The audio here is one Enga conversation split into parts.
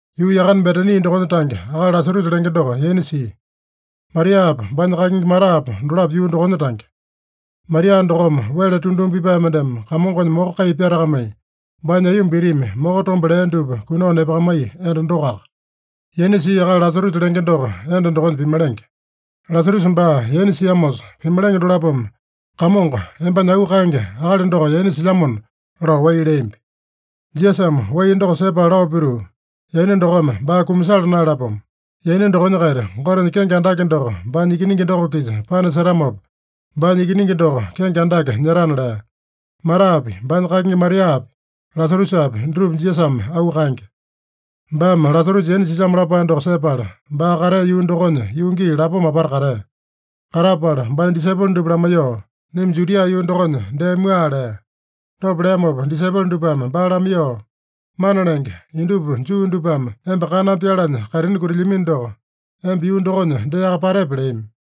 Yuu yakane Betani dokonya tange akali Lasarusa lenge doko yaina sia. Mariapa, baanya kakingi Matapa dolapo yuu dokonya tange. (Maria dokome wele tunduma pipae mendeme Kamongonya moko kai pyatakamai, baanya aiyomba itimi moko tombe lea dupa kunao nepakamaiya enda dokoaka. Yaina sia akali Lasarusa lenge doko, enda dokonya pimalenge.) Lasarusa baa yaina siamosa, pimalenge dolapome “Kamongo, embanya auu kaenge akali doko yaina silyamona” lao wai leambi. Jisasame wai doko sepala lao pituu, “Yaina dokome baa kumasala naeyalapomo. Yaina dokonya-kaita Gotenya kenge andake doko baanya Ikiningi doko-kisa panasetamopa, baanya Ikiningi doko kenge andake nyetana” lea. Matapi, baanya kakingi Mariapi, Lasarusapi dutupa Jisasame auu kaenge. Baame Lasarusa yaina silyamo lapae doko sepala, baa katea yuu dokonya yuu gii lapoma apata katea. Katapala baanya disaipolo dupa lamaiyoo, “Naima Judia yuu dokonya dee mua” lea. Dopa leamopa disaipolo dupame baa lamaiyoo, “Mana Lenge, indupa Juu dupame emba kaname pyalanya kaitini kutilyamino doko, emba yuu dokonya deaka patepe?” leami.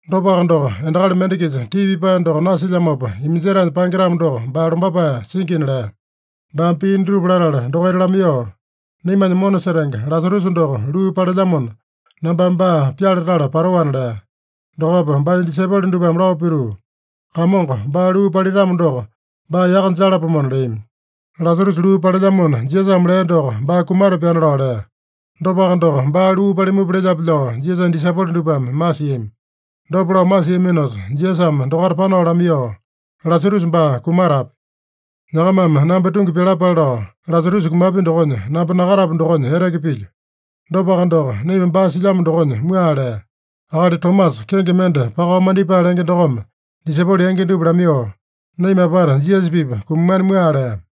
Dopaka doko, endakali mende-kisa tii pipae doko nasilyamopa iminjetaenya paenge-tamo doko, baa lombapae singina” lea. Baame pii dutupa latala dokaita lamaiyoo, “Naimanya mona setenge Lasarusa doko luu palelyamona, nambame baa pyale tala patoana” lea. Dokopa baanya disaipolo dupame lao pituu, “Kamongo, baa luu palitamo doko, baa yaka jalapomona” leami. Lasarusa luu palelyamona Jisasame lea doko, baa kumatapyana lao lea. Dopaka doko, baa luu palimupa lelyape lao Jisasanya disaipolo dupame masiami. Dopa lao masiaminosa Jisasame dokaita panao lamaiyoo, “Lasarusa baa kumatapya. Nyakamame namba tungi pyalapale lao, Lasarusa kumapya dokonya namba nakatapu dokonya eteke pilyo. Dopaka doko, naima baa silyamo dokonya mua” lea. Akali Tomasa, kenge mende Pakao Mandipae lenge dokome disaipolo yangi dupa lamaiyoo, “Naima apata Jisasa-pipa kumamana mua” lea.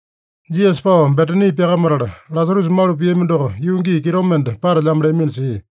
Jisasa pao Betani pyakamatala, Lasarusa malu piami doko yuu gii kitomende patelyamo leamino sia.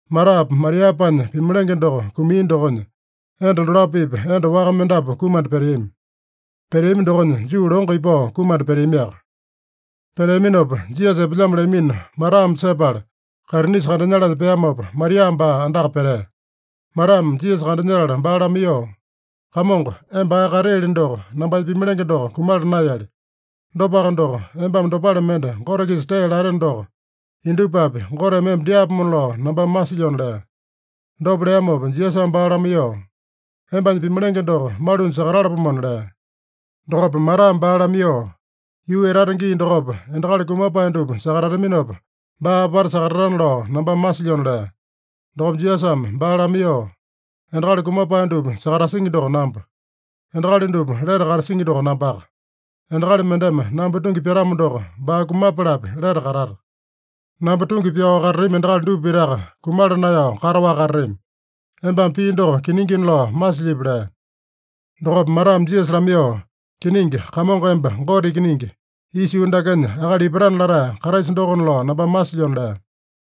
Matapa, Mariapanya pimalenge doko kumia dokonya, enda dolapo-pipa enda waka mendapu kumanda peteami. Peteami dokonya, Juu longo ipao kumanda peteamiaka. Peteaminopa, Jisasa epelyamo leamino Matame sepala, kaitinisa kandanyalanya peamopa, Maria baa andaka petea. Matame Jisasa kandanyetala baa lamaiyoo, “Kamongo, emba ae kateeli doko, nambanya pimalenge doko kumala naeyali. Dopaka doko, embame dopale mende Gote-kisa tee lateno doko, indupapi Goteme emba dyaapomona lao nambame masilyona” lea. Dopa leamopa Jisasame baa lamaiyoo, “Embanya pimalenge doko malunya sakatalapomona” lea. Dokopa Matame baa lamaiyoo, “Yuu etata gii dokopa, endakali kumapae dupa sakatataminopa, baa apata sakatatana lao nambame masilyona” lea. Dokopa Jisasame baa lamaiyoo, “Endakali kumapae dupa sakatasingi doko namba. Endakali dupa lete katasingi doko nambaka. Endakali mendeme namba tungi pyatamo doko, baa kumapalapi lete katata. Namba tungi pyao katatami endakali dupa pitaka kumala naeyao kataowaka katatami. Embame pii doko kiningina lao masilyipi?” lea. Dokopa Matame Jisasa lamaiyoo, “Kiningi, Kamongo emba Gote Ikiningi, isa yuu dakenya akali ipatana latae Kraisa dokona lao nambame masilyona” lea.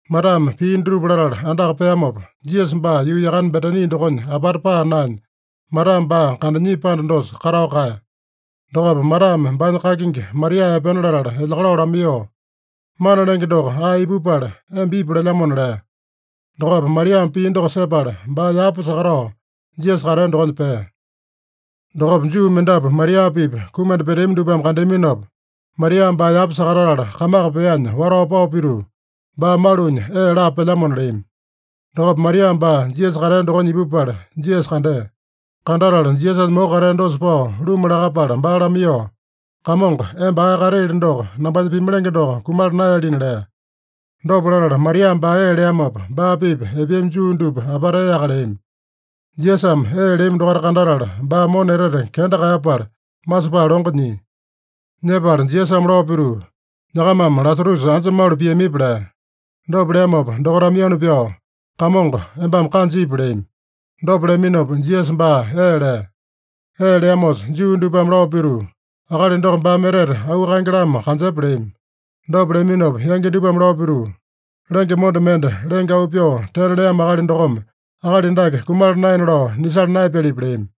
Matame pii dutupa latala andaka peamopa, Jisasa baa yuu yakane Betani dokonya apata paa naenya, Matame baa kandanyia panda dosa katao kaeya. Dokopa Matame baanya kakingi Maria epena latala elyakalao lamaiyoo, “Mana Lenge doko ae ipupala, emba ipu lelyamona” lea. Dokopa Mariame pii doko sepala, baa yapa sakatao Jisasa katea dokonya pea. Dokopa Juu mendapu Maria-pipa kumanda peteami dupame kandeaminopa, Maria baa yapa sakatatala kamaka peanya watao pao pituu, “Baa malunya ee laa pelyamona” leami. Dokopa Maria baa Jisasa katea dokonya ipupala Jisasa kandea. Kandatala Jisasanya moko katea dosa pao luma lakapala baa lamaiyoo, “Kamongo, emba ae kateeli doko, nambanya pimalenge doko kumala naeyalina” lea. Dopa latala Maria baa ee leamopa, baa-pipa epeami Juu dupa apata eaka leami. Jisasame ee leami dokaita kandatala, baa mona etete kenda kaeyapala, masepae longo nyia. Nyepala Jisasame lao pituu, “Nyakamame Lasarusa anja malu piamipi?” lea. Dopa leamopa dokaitame yanu pyao, “Kamongo, embame kanja ipu” leami. Dopa leaminopa Jisasa baa ee lea. Ee leamosa Juu dupame lao pituu, “Akali doko baame etete auu kaenge-lamo kanjepa” leami. Dopa leaminopa yangi dupame lao pituu, “Lenge monda mende lenge auu pyoo tena leamo akali dokome akali dake kumala naena lao nisala naeyapyalipi?” leami.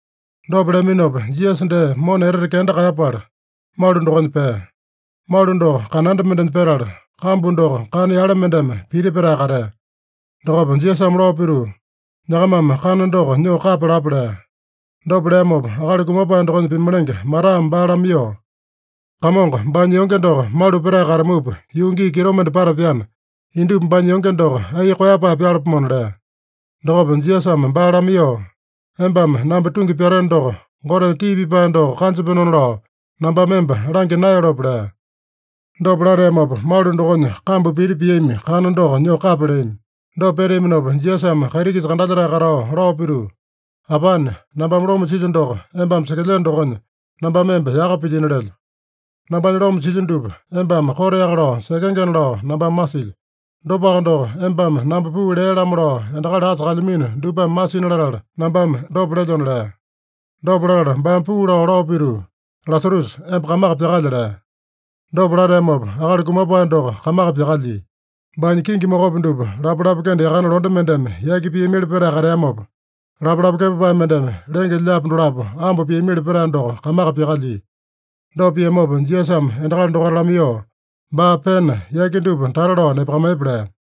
Dopa leaminopa, Jisasa dee mona etete kenda kaeyapala, malu dokonya pea. (Malu doko kananda mendenya petala, kambu doko kana yale mendeme piti petae katea.) Dokopa Jisasame lao pituu, “Nyakamame kana doko nyoo kapya lapa” lea. Dopa leamopa, akali kumapae dokonya pimalenge Matame baa lamaiyoo, “Kamongo, baanya yonge doko malu petae katamupa yuu gii kitomende patapyana, indupa baanya yonge doko ai koeyapae pyalapomona” lea. Dokopa Jisasame baa lamaiyoo, “Embame namba tungi pyateno doko, Gotenya tii pipae doko kanjapenona lao nambame emba langya naeyalope?” lea. Dopa lateamopa, malu dokonya kambu piti piami kana doko nyoo kapya leami. Dopa peteaminopa, Jisasame kaiti-kisa kandalyetae katao lao pituu, “Apane, nambame loma silyo doko embame sekelyeno dokonya, nambame emba yaka pilyino lelyo. Nambanya loma silyo dupa embame koteaka lao sekengena lao nambame masilyo. Dopaka doko, embame namba puu lea-lamo lao endakali asa kalyamino dupame masina latala nambame dopa lelyona” lea. Dopa latala baame puu lao, lao pituu, “Lasarusa, emba kamaka pyakalya!” lea. Dopa lateamopa akali kumapae doko kamaka pyakalyia. Baanya kingi mokopi dupa lapalapa kende yakane londe mendeme yaki piamili petae kateamopa, lapalapa kepapae mendeme lenge-lyaapi dolapo ambo piamili petae doko kamaka pyakalyia. Dopa piamopa Jisasame endakali dokaita lamaiyoo, “Baa pena, yaki dupa tata lao nepakamaiyepa” lea.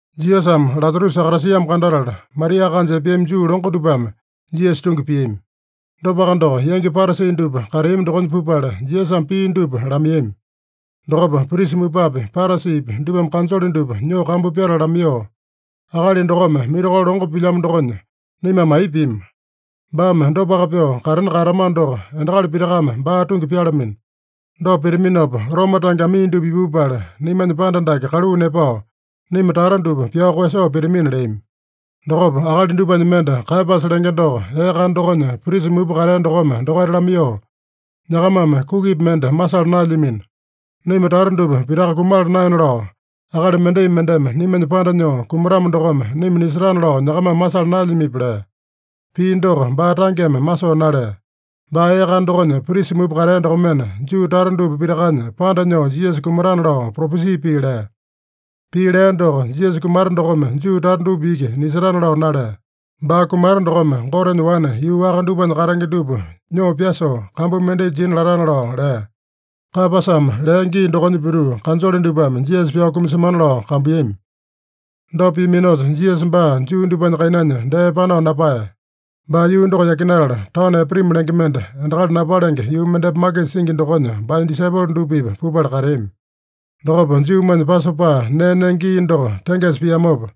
Jisasame Lasarusa sakatasiamo kandatala, Maria kanja epeami Juu longo dupame Jisasa tungi piami. Dopaka doko, yangi Parasi dupa kateami dokonya pupala, Jisasame pia dupa lamaiyami. Dokopa prisa mupapi, Parasipi dupame kanjole dupa nyoo kambu pyatala lamaiyoo, “Akali dokome mirakolo longo pilyamo dokonya, naimame aipa pima? Baame dopaka pyoo katena kaeyatamano doko, endakali pitakame baa tungi pyalamino. Dopa pitaminopa, Roma tange amii dupa ipupala, naimanya panda dake kaluu nepao, naima tata dupa pyao koeyasoo pitamina” leami. Dokopa akali dupanya mende, Kaeyapasa lenge doko, ee kana dokonya prisa mupa katea dokome dokaita lamaiyoo, “Nyakamame kukipi mende masala naelyamino. Naima tata dupa pitaka kumala naena lao, akali mendai mendeme naimanya panda nyoo kumatamo dokome naima nisetana lao nyakamame masala naelyamipi?” lea. (Pii doko baa tangeme masoo nalea. Baa ee kana dokonya prisa mupa katea dokomena, Juu tata dupa pitakanya panda nyoo Jisasa kumatana lao propesi pii lea.) Pii lea doko, Jisasa kumata dokome Juu tata dupa iki nisetana lao nalea. Baa kumata dokome Gotenya wane yuu waka dupanya katenge dupa nyoo pyasoo, kambu mendai jina latana lao lea. Kaeyapasame lea gii dokonya pituu, kanjole dupame Jisasa pyao kumasemana lao kambuiyami. Dopa piaminosa, Jisasa baa Juu dupanya kainanya dee panao napaeya. Baa yuu doko yakinatala, taono Epraimi lenge mende, endakali napalenge yuu mendepa makisa singi dokonya baanya disaipolo dupa-pipa pupala kateami. Dokopa Juumanya Pasopa nee nenge gii doko tengesa piamopa,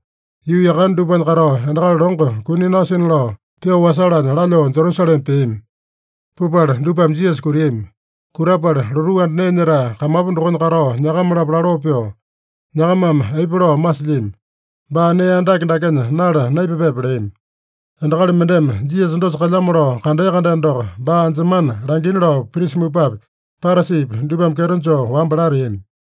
yuu yakane dupanya katao endakali longo kuni nasina lao pyoo wasalanya lalyoo Jerusalema peami. Pupala dupame Jisasa kutiami. Kutapala lotuu anda nee nyetae kamapu dokonya katao nyakama-lapo laloo pyoo, “Nyakamame aipa lao masilyami? Baa nee andake dakenya nala naipapepe?” leami. (Endakali mendeme Jisasa dosa kalyamo lao kandea-kandeno doko, baa anjemana langina lao prisa mupapi, Parasipi dupame kyeto joo wamba lateami.)